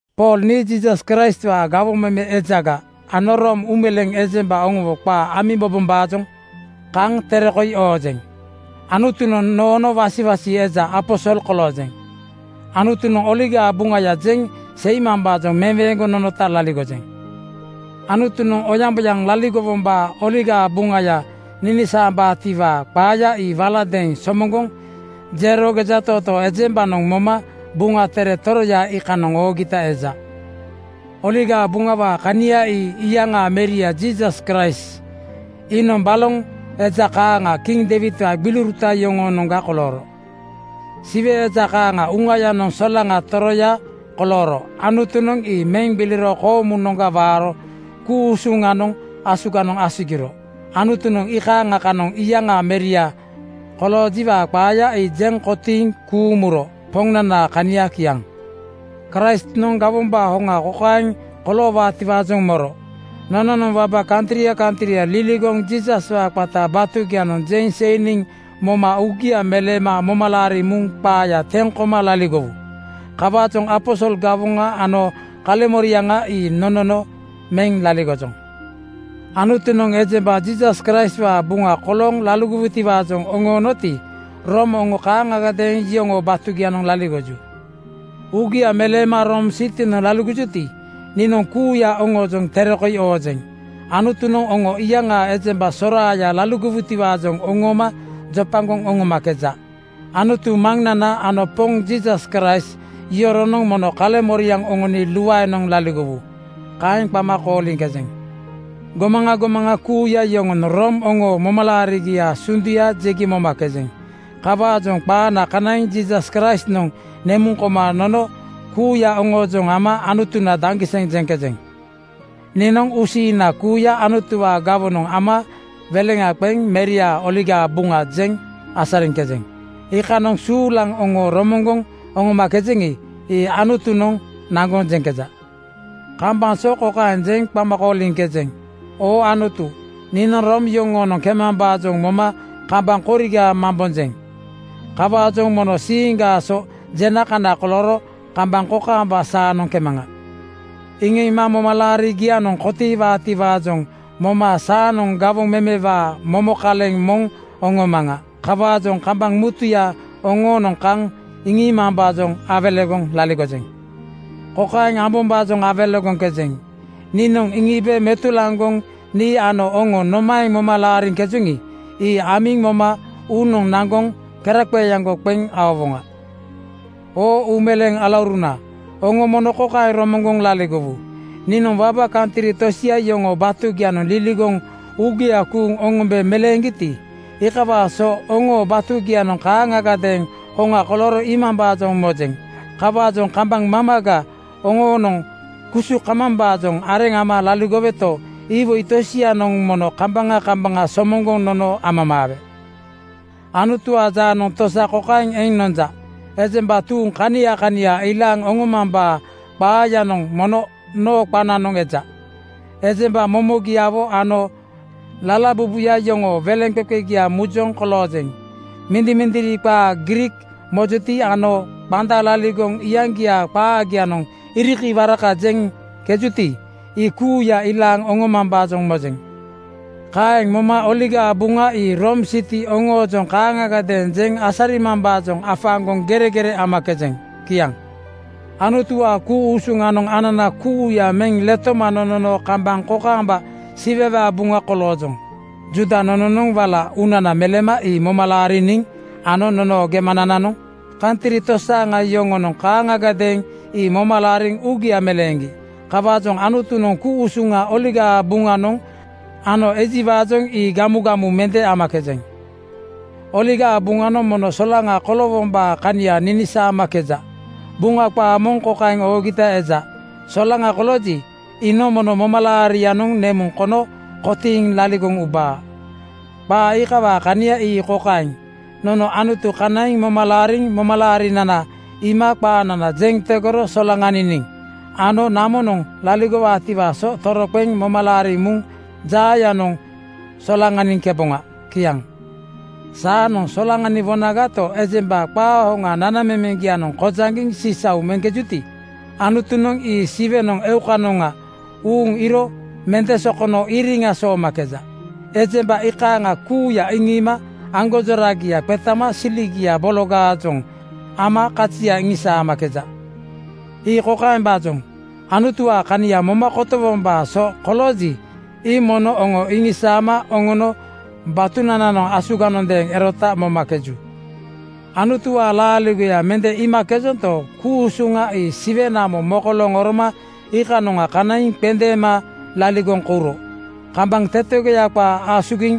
Pool nii Jiisas Kraistwaa gawoŋ meme ejaga ano Room uumeleeŋ ejemba oŋowo qaa amiŋ mobombaajoŋ kaŋ tere koi oojeŋ. Anutunoŋ noono wasiwasi eja aposol koloojeŋ. Anutunoŋ Oligaa Buŋaya jeŋ seimambaajoŋ meweeŋgoŋ nonota laligojeŋ. Anutunoŋ oyamboyaŋ laligowombaa Oligaa Buŋaya ninisaambaatiwaa qaaya ii waladeeŋ somoŋgoŋ jero gejatootoo ejembanoŋ moma Buŋa Tere toroya iikanoŋ oogita eja. Oligaa Buŋawaa kania ii iyaŋaa meria Jiisas Kraist. Iinoŋ baloŋ eja kaaŋa kiŋ Deiwidwaa gbiliuruta yoŋoonoŋga kolooro. Siwe eja kaaŋa Uŋayanoŋ solaŋa toroya kolooro. Anutunoŋ ii meŋ gbiliro koomunoŋga waaro ku-usuŋanoŋ asuganoŋ asugiro. Anutunoŋ iikaaŋa kanoŋ iyaŋaa Meria koloojiwaa qaaya ii jeŋ kotiiŋ kuuŋ muro. Poŋnanaa kania kiaŋ. Kraistnoŋ gawombaa hoŋa kokaeŋ koloowaatiwaajoŋ moro: Nononoŋ waba kantria kantria liligoŋ Jiisaswaa qata batugianoŋ jeŋ seiniŋ moma uugia meleema moma laariŋ muŋ qaaya teŋ koma laligowu. Kawaajoŋ aposol gawoŋa ano kaleŋmoriaŋa ii nonono meŋ laligojoŋ. Anutunoŋ ejemba Jiisas Kraistwaa buŋa kolooŋ laligowutiwaajoŋ oŋoonoti, Room oŋo kaaŋagadeeŋ iyoŋoo batugianoŋ laligoju. Uugia meleema Room sitinoŋ laligojuti, niinoŋ kuuya oŋoojoŋ tere koi oojeŋ. Anutunoŋ oŋo iyaŋaa ejemba soraaya laligowutiwaajoŋ oŋooma jopagoŋ oŋomakeja. Anutu Maŋnana ano Poŋ Jiisas Kraist yoronoŋ mono kaleŋmoriaŋ oŋoni luaenoŋ laligowu. Kaeŋ qama kooliŋkejeŋ. Gomaŋa gomaŋa kuuya yoŋonoŋ Room oŋoo momalaarigiaa sunduya jegi momakejeŋ. Kawaajoŋ qaana kanaiŋ Jiisas Kraistnoŋ nemuŋ koma nono kuuya oŋoojoŋ ama Anutuna daŋgiseŋ jeŋkejeŋ. Niinoŋ uusiiŋna kuuya Anutuwaa gawonoŋ ama weleŋa qeŋ Meriaa Oligaa Buŋa jeŋ asariŋkejeŋ. Iikanoŋ suulaŋ oŋo romoŋgoŋ oŋomakejeŋi, ii Anutunoŋ naŋgoŋ jeŋkeja. Kambaŋ so kokaeŋ jeŋ qama kooliŋkejeŋ, “Oo Anutu, niinoŋ Room yoŋoonoŋ kemambaajoŋ moma kambaŋ koriga mambonjeŋ. Kawaajoŋ mono siiŋgaa so jena kana kolooro kambaŋ kokaamba saanoŋ kemaŋa.” Iŋiima momalaarigianoŋ kotiiwaatiwaajoŋ moma saanoŋ gawoŋ memewaa momo kaleŋ moŋ oŋomaŋa. Kawaajoŋ kambaŋ mutuya oŋoonoŋ kaŋ iŋiimambaajoŋ awelegoŋ laligojeŋ. Kokaeŋ ambombaajoŋ awelegoŋkejeŋ: Niinoŋ iŋiibe metulaŋgoŋ nii ano oŋo nomaeŋ moma laariŋkejoŋi, ii amiŋ moma uunoŋ naŋgoŋ keraqeeaŋgo qeŋ aowoŋa. Oo uumeleeŋ alauruna, oŋo mono kokaeŋ romoŋgoŋ laligowu: Niinoŋ waba kantri tosia yoŋoo batugianoŋ liligoŋ uugia kuuŋ oŋombe meleeŋgiti, iikawaa so oŋoo batugianoŋ kaaŋagadeeŋ hoŋa kolooro iimambaajoŋ mojeŋ. Kawaajoŋ kambaŋ mamaga oŋoonoŋ kusu kamambaajoŋ areŋ ama laligoweto, iwoi tosianoŋ mono kambaŋa kambaŋa somoŋgoŋ nono amamaawe. Anutuwaa jaanoŋ tosa kokaeŋ eŋ nonja: Ejemba tuuŋ kania kania ilaaŋ oŋomambaa qaayanoŋ mono noo qananoŋ eja. Ejemba momogiawo ano lalabubuya yoŋoo weleŋqeqegia mujoŋ koloojeŋ. Mindimindiri qaa Griik mojuti ano qanda laligoŋ iyaŋgiaa qaagianoŋ irikawaraka jeŋkejuti, ii kuuya ilaaŋ oŋomambaajoŋ mojeŋ. Kaeŋ moma Oligaa Buŋa ii Room siti oŋoojoŋ kaaŋagadeeŋ jeŋ asarimambaajoŋ afaaŋgoŋ geregere amakejeŋ. Kiaŋ. Anutuwaa ku-usuŋanoŋ anana kuuya meŋ letoma nonono kambaŋ kokaamba Siwewaa buŋa koloojoŋ. Juuda nononoŋ wala uunana meleema ii moma laariniŋ ano nonoo gemanananoŋ kantri tosaaŋa yoŋonoŋ kaaŋagadeeŋ ii moma laariŋ uugia meleeŋgi. Kawaajoŋ Anutunoŋ ku-usuŋa Oligaa Buŋanoŋ ano ejiwaajoŋ ii gamugamu mende amakejeŋ. Oligaa Buŋanoŋ mono solaŋa koloowombaa kania ninisaamakeja. Buŋa qaa moŋ kokaeŋ oogita eja, “Solaŋa kolooji, iinoŋ mono momalaariŋanoŋ nemuŋ kono kotiiŋ laligoŋ ubaa. Qaa iikawaa kania ii kokaeŋ: Nono Anutu kanaiŋ moma laariniŋ momalaarinana iima qaanana jeŋ tegoro solaŋaniniŋ ano namonoŋ laligowoŋatiwaa so toroqeŋ moma laariŋ muŋ jaayanoŋ solaŋaniŋkeboŋa.” Kiaŋ. Saanoŋ solaŋaniwonagato, ejemba qaa hoŋa nanamemeŋgianoŋ kojaŋgiŋ sisau meŋkejuti, Anutunoŋ ii Siwenoŋ eukanoŋa uuŋ iiro mende sokono iriŋa soomakeja. Ejemba iikaaŋa kuuya iŋiima aŋgonjoragia qetama siligia bologaajoŋ ama kazia iŋisaamakeja. Ii kokaembaajoŋ: Anutuwaa kania moma kotowombaa so kolooji, ii mono aŋo iŋisaama oŋono batunananoŋ asuganondeeŋ erota momakeju. Anutuwaa laaligoya mende iimakejonto, ku-usuŋa ii Siwe namo mokolooŋ oroma iikanoŋa kanaiŋ qendeema laligoŋ kouro kambaŋ tetegoya qaa asugiŋ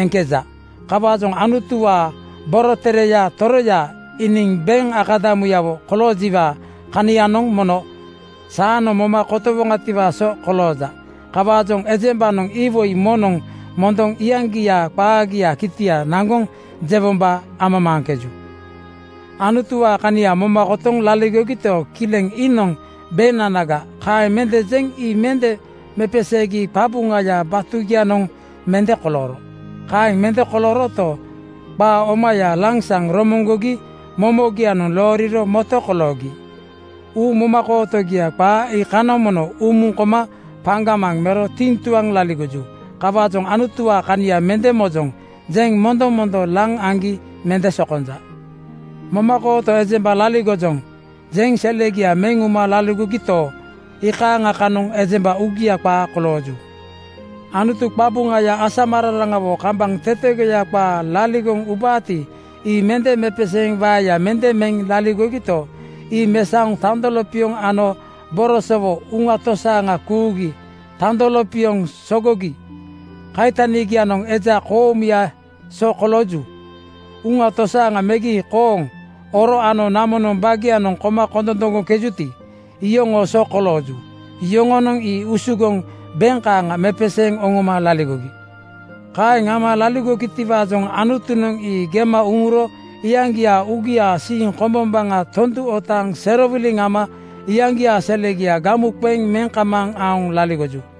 eŋkeja. Kawaajoŋ Anutuwaa borotereya tororo iiniŋ beŋ akadamuyawo koloojiwaa kanianoŋ mono saanoŋ moma kotowoŋatiwaa so kolooja. Kawaajoŋ ejembanoŋ iwoi moŋnoŋ mondoŋ iyaŋgiaa qaagiaa kitia naŋgoŋ jewombaajoŋ amamaaŋkeju. Anutuwaa kania moma kotoŋ laligogito, kileŋ “Iinoŋ beŋnanaga,” kaeŋ mende jeŋ ii mende mepeseegi qabuŋaya batugianoŋ mende kolooro. Kaeŋ mende kolooroto, qaa omaya lansaŋ romoŋgogi momogianoŋ looriro moto koloogi. Uu momakootogia qaa iikanoŋ mono umuŋ koma paŋgamaŋ mero tiŋtuaŋ laligoju. Kawaajoŋ “Anutuwaa kania mende mojoŋ,” jeŋ mondomondo laŋ aŋgi mende sokonja. “Momakooto ejemba laligojoŋ,” jeŋ selegia meŋ uma laligogito, iikaaŋa kanoŋ ejemba uugia qaa kolooju. Anutu qabuŋaya asamararaŋawo kambaŋ tetegoya qaa laligoŋ ubaati, ii mende mepeseeŋ waeya mende meŋ laligogito, ii mesaoŋ tando lopioŋ ano borosowo uŋa tosaaŋa kuugi. Tando lopioŋ sogogi kaitanigianoŋ eja koomuyaa so kolooju. Uŋa tosaaŋa megi kooŋ, oro ano namonoŋ bagianoŋ koma kondondoŋgoŋkejuti, iyoŋoo so kolooju. Yoŋonoŋ ii usugoŋ beŋ kaaŋa mepeseeŋ oŋoma laligogi. Kaeŋ ama laligogitiwaajoŋ Anutunoŋ ii gema uŋuro iyaŋgiaa uugiaa siiŋ kombombaŋa tondu otaaŋ serowiliŋ ama iyaŋgiaa selegia gamu qeŋ meŋ kamaaŋ aoŋ laligoju.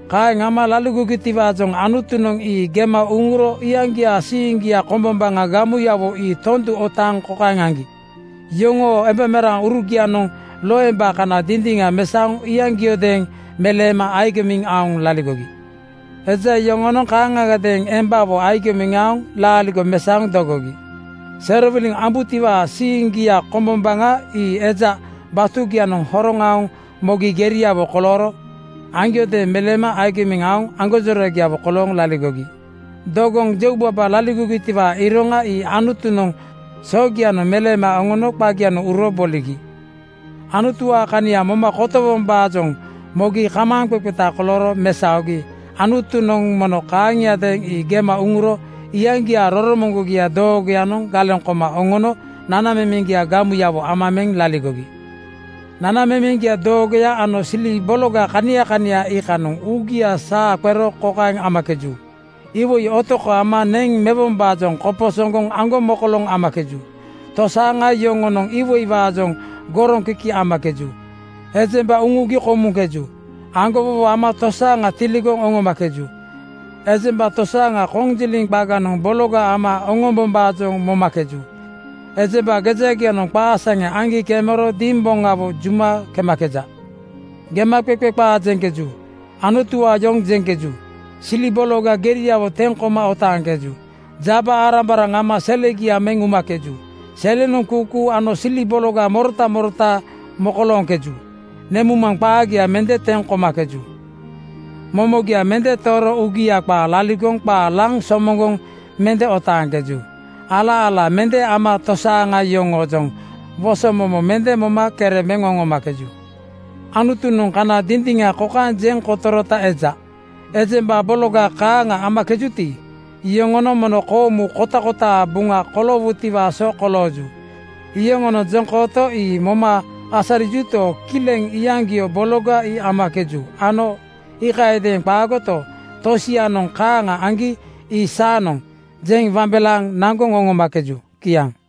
Kaeŋ ama laligogitiwaajoŋ Anutunoŋ ii gema uŋuro iyaŋgiaa siiŋgia kombombaŋa gamuyawo ii tondu otaaŋ kokaeŋ aŋgi: Yoŋoo embaurugianoŋ loemba kana dindiŋa mesaoŋ iyaŋgiodeeŋ meleema agimiŋ aoŋ laligogi. Eja yoŋonoŋ kaaŋagadeeŋ embawo agimiŋ aoŋ laaligo mesaoŋ dogogi. Serowiliŋ ambutiwaa siiŋgia kombombaŋa ii eja batugianoŋ horoŋ aoŋ mogi geriawo kolooro aŋgiodeeŋ meleema agimiŋ aoŋ aŋgonjoragiawo kolooŋ laligogi. Dogoŋ jeubaba laligogitiwaa iroŋa ii Anutunoŋ sogianoŋ meleema oŋono qagianoŋ uro boligi. Anutuwaa kania moma kotowombaajoŋ mogi kamaaŋqeqeta kolooro mesaogi Anutunoŋ mono kaaŋiadeeŋ ii gema uŋuro iyaŋgiaa roromoŋgogia doogoyanoŋ galeŋ koma oŋono nanamemeŋ gamuyawo ama meŋ laligogi. Nanamemeŋ doogoya ano sili bologa kania kania iikanoŋ uugia saa qero kokaeŋ amakeju: Iwoi otoko ama neŋ mewombaajoŋ koposoŋgoŋ aŋgomokoloŋ amakeju. Tosaaŋa yoŋoonoŋ iwoiwaajoŋ goroŋkiki amakeju. Ejemba uŋugi komuŋkeju. Aŋgowowo ama tosaaŋa tiligoŋ oŋomakeju. Ejemba tosaaŋa konjiliŋ qaganoŋ bologa ama oŋombombaajoŋ momakeju. Ejemba gejagianoŋ qaa saŋe aŋgi kemero dimboŋawo juma kemakeja. Gemaqeqe qaa jeŋkeju. Anutuwaa yoŋ jeŋkeju. Sili bologa geriawo teŋ koma otaaŋkeju. Jaba-arambaraŋ ama selegia meŋ umakeju. Selenoŋ kuukuu ano sili bologa morota morota mokolooŋkeju. Nemuŋmaŋ qaagia mende teŋ komakeju. Momogia mende tooro uugia qaa laligoŋ qaa laŋ somoŋgoŋ mende otaaŋkeju. Ala-ala mende ama tosaaŋa yoŋoojoŋ wosomomo mende moma kere meŋ oŋomakeju. Anutunoŋ kana dindiŋa kokaeŋ jeŋ kotorota eja: Ejemba bologa kaaŋa amakejuti, iyoŋonoŋ mono koomu kotakotaa buŋa koloowutiwaa so kolooju. Yoŋonoŋ jeŋkooto ii moma asarijuto, kileŋ iyaŋgio bologa ii amakeju ano iikayadeeŋ qaagoto, tosianoŋ kaaŋa aŋgi ii “Saanoŋ!” jeŋ wambelaaŋ naŋgoŋ oŋomakeju. Kiaŋ.